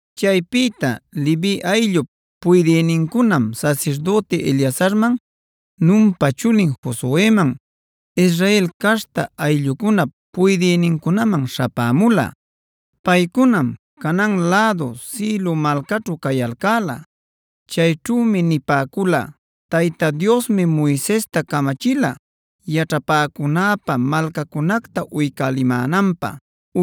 Chaypïta Levi ayllup puydïnincunam sasirdüti Eleazarman, Nunpa chulin Josueman, Israel caśhta ayllucunap puydïnincunaman śhapämula. Paycunam Canaan lädu Silo malcaćhu cayalcäla. Chayćhümi nipäcula: “Tayta Diosmi Moisesta camachila yaćhapäcunäpä malcacunacta uycälimänanpä,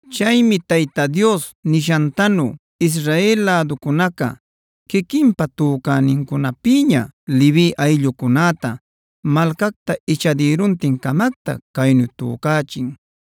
Chaymi Tayta Dios nishantanu Israel läducunaca quiquinpa tücänincunapïña Levi ayllucunäta malcacta ichadïruntin-camacta caynu tücachin: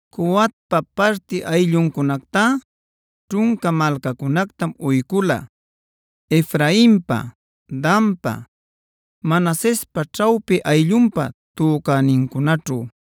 Coatpa parti aylluncunactá ćhunca malcacunactam uycula Efrainpa, Danpa, Manasespa ćhawpi ayllunpa tücänincunaćhu.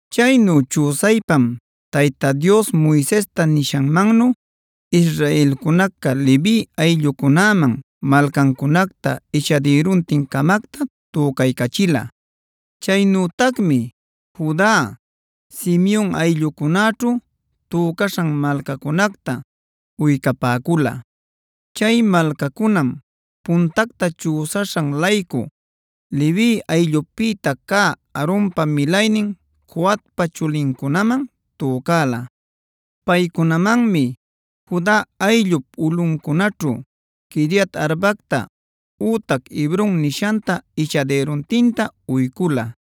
Chaynu chüsaypam Tayta Dios Moisesta nishanmannu israelcunaca Levi ayllucunäman malcancunacta ichadïruntin-camacta tücaycachila. Chaynütacmi Juda, Simeon ayllucunäćhu tücaśhan malcancunacta uycapäcula. Chay malcacunam puntacta chüsaśhan-laycu Levi ayllupïta cä Aaronpa milaynin Coatpa chulincunaman tücäla. Paycunamanmi Juda ayllup ulꞌuncunaćhu Quiriat-arbacta ütac Hebron nishanta ichadïruntinta uycula.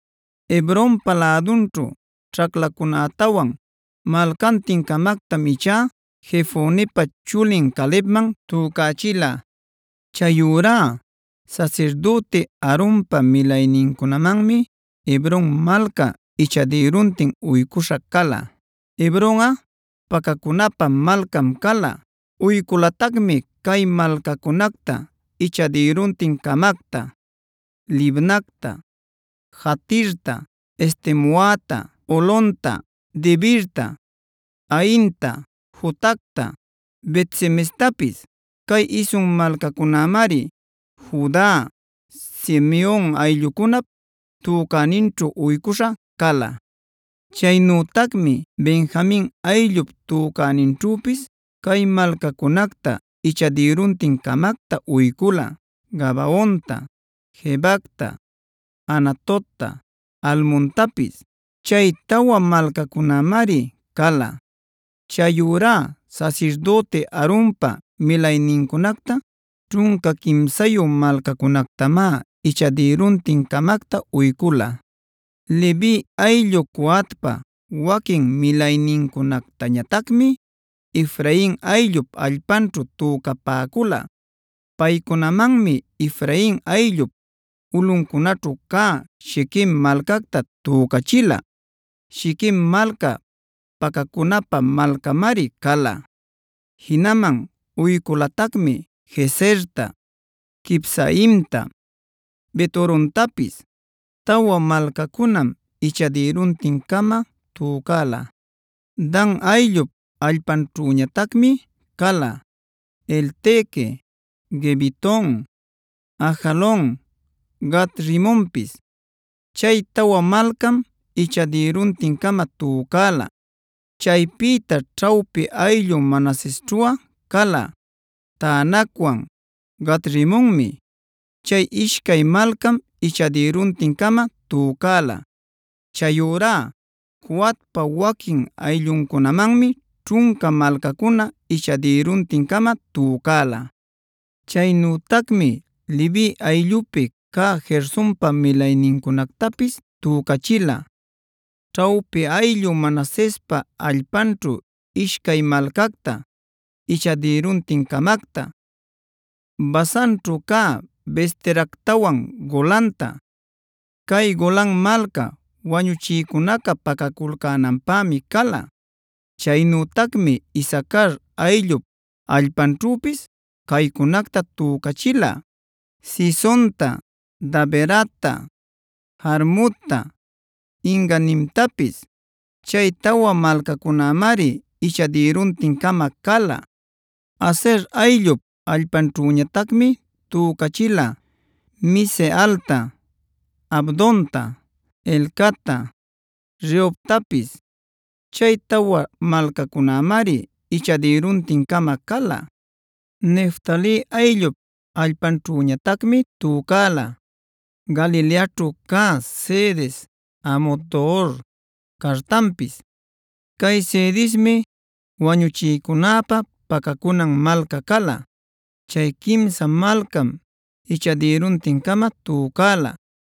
Hebronpa lädunćhu ćhaclacunätawan malcantin-camactam ichá Jefonepa chulin Calebman tücachila. Chayurá sasirdüti Aaronpa milaynincunamanmi Hebron malca ichadïruntin uycuśha cala. Hebronꞌa pacacunapä malcam cala. Uyculatacmi cay malcacunacta ichadïruntin-camacta: Libnacta, Jatirta, Estemoata, Holonta, Debirta, Ainta, Jutacta, Bet-semestapis. Cay isun malcacunamari Juda, Simeon ayllucunap tücäninćhu uycuśha cala. Chaynütacmi Benjamin ayllup tücäninćhüpis cay malcacunacta ichadïruntin-camacta uycula: Gabaonta, Gebacta, Anatotta, Almontapis. Chay tawa malcacunamari cala. Chayurá sasirdüti Aaronpa milaynincunacta ćhunca quimsayu malcacunactamá ichadïruntin-camacta uycula. Levi ayllu Coatpa waquin milaynincunactañatacmi Efrain ayllup allpanćhu tücapäcula. Paycunamanmi Efrain ayllup ulꞌuncunaćhu cä Shiquem malcacta tücachila. Shiquem malca pacacunapä malcamari cala. Jinaman uyculatacmi: Gezerta, Kibsaimta, Bet-horontapis. Tawa malcacunam ichadïruntin-cama tücala. Dan ayllup allpanćhüñatacmi cala: Elteque, Gibeton, Ajalon, Gat-rimonpis. Chay tawa malcam ichadïruntin-cama tücala. Chaypïta ćhawpi ayllu Manasesćhuꞌa cala: Taanacwan Gat-rimonmi. Chay ishcay malcam ichadïruntin-cama tücala. Chayurá Coatpa waquin aylluncunamanmi ćhunca malcacuna ichadïruntin-cama tücala. Chaynütacmi Levi ayllupi cä Gersonpa milaynincunactapis tücachila ćhawpi ayllu Manasespa allpanćhu ishcay malcacta ichadïruntin-camacta: Basanćhu cä Beesteractawan Golanta; cay Golan malca wañuchïcunaca pacaculcänanpämi cala. Chaynütacmi Isacar ayllup allpanćhüpis caycunacta tücachila: Cisonta, Daberatta, Jarmutta, En-ganimtapis. Chay tawa malcacunamari ichadïruntin-cama cala. Aser ayllup allpanćhüñatacmi tücachila: Misealta, Abdonta, Helcatta, Rehobtapis. Chay tawa malcacunamari ichadïruntin-cama cala. Neftali ayllup allpanćhüñatacmi tücala: Galileaćhu cä Cedes, Hamot-dor, Cartanpis. Cay Cedesmi wañuchïcunäpä pacacunan malca cala. Chay quimsa malcam ichadïruntin-cama tücala.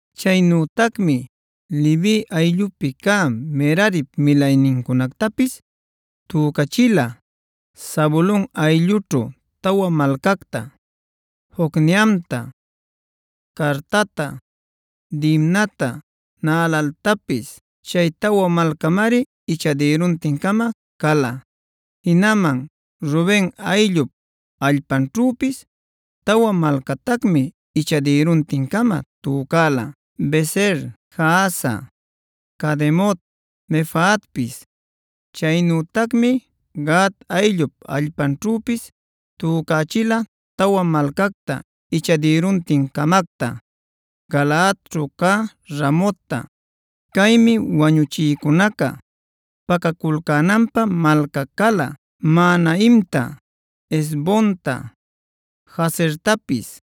Chaynütacmi Levi ayllupi cä Merarip milaynincunactapis tücachila Zabulon ayllućhu tawa malcacta: Jocneamta, Cartata, Dimnata, Naalaltapis. Chay tawa malcamari ichadïruntin-cama cala. Jinaman Ruben ayllup allpanćhüpis tawa malcatacmi ichadïruntin-cama tücala: Beser, Jahaza, Cademot, Mefaatpis. Chaynütacmi Gad ayllup allpanćhüpis tücachila tawa malcacta ichadïruntin-camacta: Galaadćhu cä Ramotta (Caymi wañuchïcunaca pacaculcänanpä malca cala), Mahanaimta, Hesbonta, Jazertapis.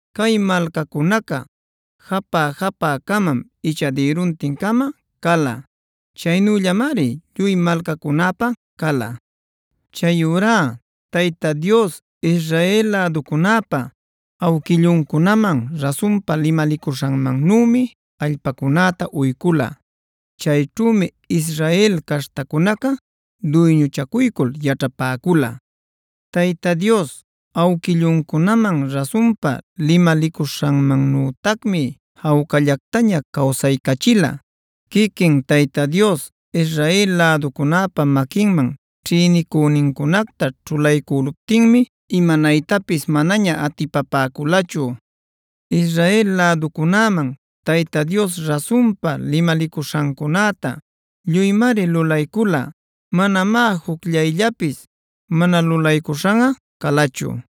Cay malcacunaca japä-japä-camam ichadïruntin-cama cala. Chaynüllamari lluy malcacunäpä cala. Chayurá Tayta Dios Israel läducunäpa awquilluncunaman rasunpa limalicuśhanmannümi allpacunäta uycula. Chayćhümi Israel caśhtacunaca duyñuchacuycul yaćhapäcula. Tayta Dios awquilluncunaman rasunpa limalicuśhanmannütacmi jawcallactaña cawsaycachila. Quiquin Tayta Dios Israel läducunäpa maquinman ćhïnicünincunacta ćhulaycüluptinmi imanaytapis manaña atipapäculachu. Israel läducunäman Tayta Dios rasunpa limalicuśhancunäta lluymari lulaycula; manamá jucllayllapis mana lulaycuśhanꞌa calachu.